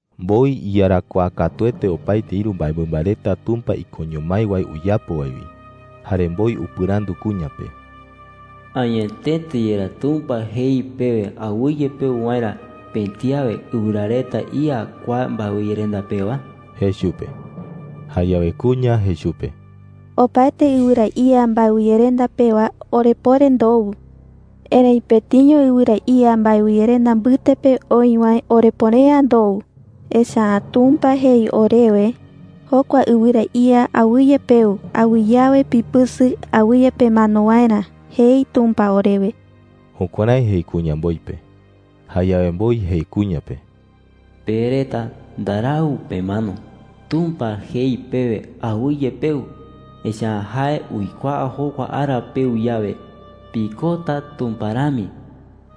Mboi iyarakuaa katuete opaete ïru mbaemɨmba reta Tumpa ikoño mái wae uyapo wae wi. Jare mboi upɨrandu kuña pe: “¿Añetete yerá Tumpa jei pewe awɨye peu waerä pëti awe ɨwɨra reta ía kua mbaewɨyerenda pewa?” jei chupe. Jayawe kuña jei chupe: “Opaete ɨwɨra ía mbaewɨyerenda pewa orepuere ndou. Erëi pëtiño ɨwɨra ía mbaewɨyerenda mbɨte pe oï wae orepuere’ä ndou. Echa’ä Tumpa jei orewe: ‘Jokua ɨwɨra ía awɨye peu. Awɨye awe pipɨsɨ awɨye pemano waerä,’ jei Tumpa orewe.” Jukuärái jei kuña mboi pe. Jayawe mboi jei kuña pe: “Pe reta ndarau pemano,” jei. “Tumpa jei pewe, ‘Awɨye peu,’ echa’ä jae uikuaa jokua ara peu yawe, pikota Tumpa rami,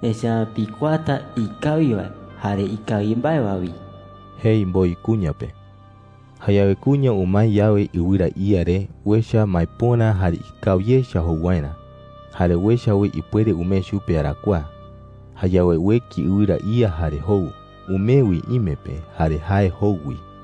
echa’ä pikuaata ikawi wae jare ikawi mbae wi,” jei mboi kuña pe. Jayawe kuña umae yawe ɨwɨra ía re, uecha maepöra jare ikawi echa jou waerä. Jare uecha wi ipuere umee chupe arakuaa. Jayawe ueki ɨwɨra ía jare jou. Umee wi ime pe, jare jae jou wi.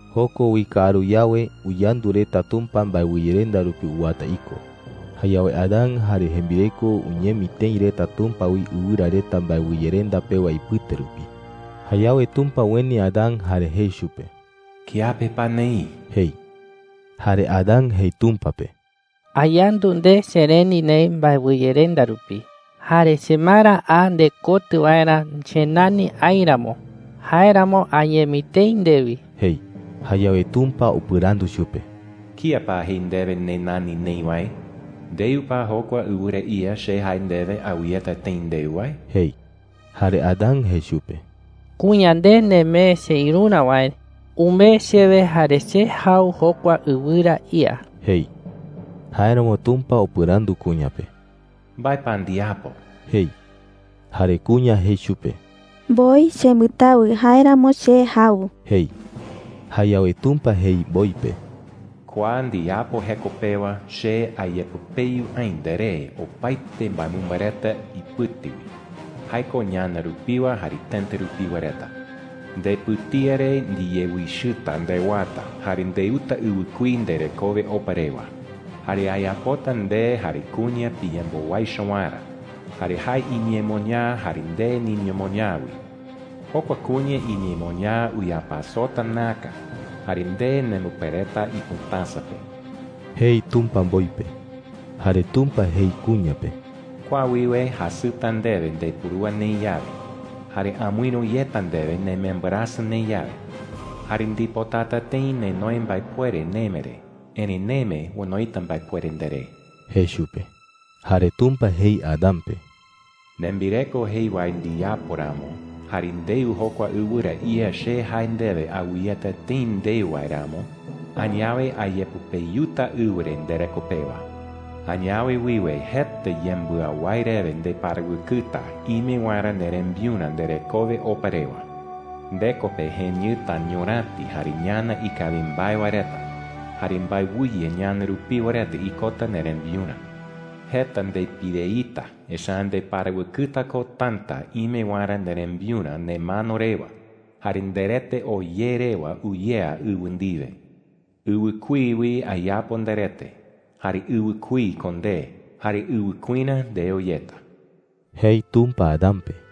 Joko wi kaaru yawe, uyandu reta Tumpa mbaewɨyerenda rupi uwata iko. Jayawe Adán jare jembireko uñemi tëi reta Tumpa wi ɨwɨra reta mbaewɨyerenda pewa ipɨte rupi. Jayawe Tumpa ueni Adán jare jei chupe: “¿Kiape pa neï?” jei. Jare Adán jei Tumpa pe: “Ayandu nde chereni neï mbaewɨyerenda rupi, jare chemara a ndekotɨ waerä chenani aï ramo. Jáeramo añemi tëi ndewi,” jei. Jayawe Tumpa upɨrandu chupe: “¿Kía pa jei ndewe nenani neï wae? ¿Ndeu pa jokua ɨwɨra ía che jae ndewe awɨyeta tëi ndeu wae?” jei. Jare Adán jei chupe: “Kuña nde nemee cheïrurä wae umee chewe jare che jau jokua ɨwɨra ía,” jei. Jáeramo Tumpa upɨrandu kuña pe: “¿Mbae pa ndiyapo?” jei. Jare kuña jei chupe: “Mboi chembɨtawɨ; jáeramo che jau,” jei. Jayawe Tumpa jei mboi pe: “Kua ndiyapo jeko pewa che ayepɨpeyu aï nderé opaete mbaemɨmba reta ipɨte wi – jae ko ñana rupiwa jare tëta rupiwa reta,” jei. “Ndepɨtía re ndiyewichɨta ndewata, jare ndeuta ɨwɨkuí nderekowe opa rewa. Jare ayapota nde jare kuña piyembowaicho waerä, jare jae iñemoñaa jare nde niñemoñaa wi. Jokua kuña iñemoñaa uyapasota näka, jare nde nembɨpereta ipɨtäsa pe,” jei Tumpa mboi pe. Jare Tumpa jei kuña pe: “Kua wiwe jasɨta ndewe ndepurúa neï yawe, jare amɨïru yeta ndewe nemembɨrasɨ neï yawe. Jare ndipotata tëi nenoi mbaepuere neme re, erëi neme onoita mbaepuere nderé,” jei chupe. Jare Tumpa jei Adán pe: “Nembireko jei wae ndiyapo ramo, jare ndeu jokua ɨwɨra ía che jae ndewe awɨyeta tëi ndeu wae ramo, añawe ayepɨpeyuta ɨwɨ re ndereko pewa,” jei. “Añawe wiwe jeta yembɨawái rewe ndeparawɨkɨta ime waerä nderembiurä nderekowe opa rewa. Ndeko pe jeñɨta ñuräti jare ñana ikawi mbae wae reta. Jare mbaewɨye ñana rupiwa reta ikota nderembiurä. Jeta ndepireita, echa’ä ndeparawɨkɨta ko täta ime waerä nderembiurä nemano rewa jare nderete oo ye rewa uyea ɨwɨ ndiwe. Ɨwɨkuí wi ayapo nderete, jare ɨwɨkuí ko nde, jare ɨwɨkuirä ndeo yeta,” jei Tumpa Adán pe.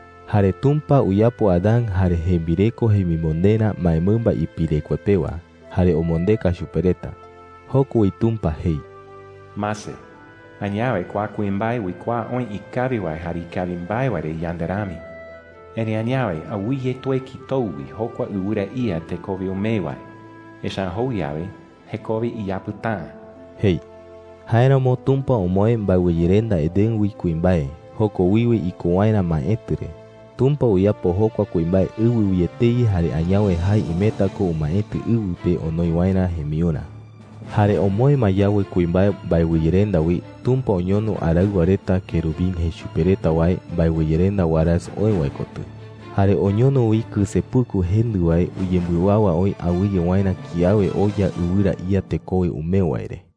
Jare Tumpa uyapo Adán jare jembireko jemimonderä mbaemɨmba ipirekue pewa, jare omondeka chupe reta. Joko wi Tumpa jei: “Mase, añawe kua kuimbae uikuaa oï ikawi wae jare ikawi mbae wae re yande rami. Erëi añawe, awɨye tueki tou wi jokua ɨwɨra ía tekowe umee wae. Echa’ä jou yawe, jekowe iyapɨta’ä,” jei. Jáeramo Tumpa omoë mbaewɨyerenda Edén wi kuimbae, joko wiwe iko waerä maetɨ re. Tumpa uyapo jokua kuimbae ɨwɨ wi etei jare añawe jae imeta ko umaetɨ ɨwɨ pe onoi waerä jembiurä. Jare omoë ma yawe kuimbae mbaewɨyerenda wi, Tumpa oñono araɨwa reta, kerubín jei chupe reta wae, mbaewɨyerenda warasɨ oë wae kotɨ. Jare oñono wi kɨsepuku jendɨ wae uyembɨwawa oï awɨye waerä kiawe oya ɨwɨra ía tekowe umee wae re.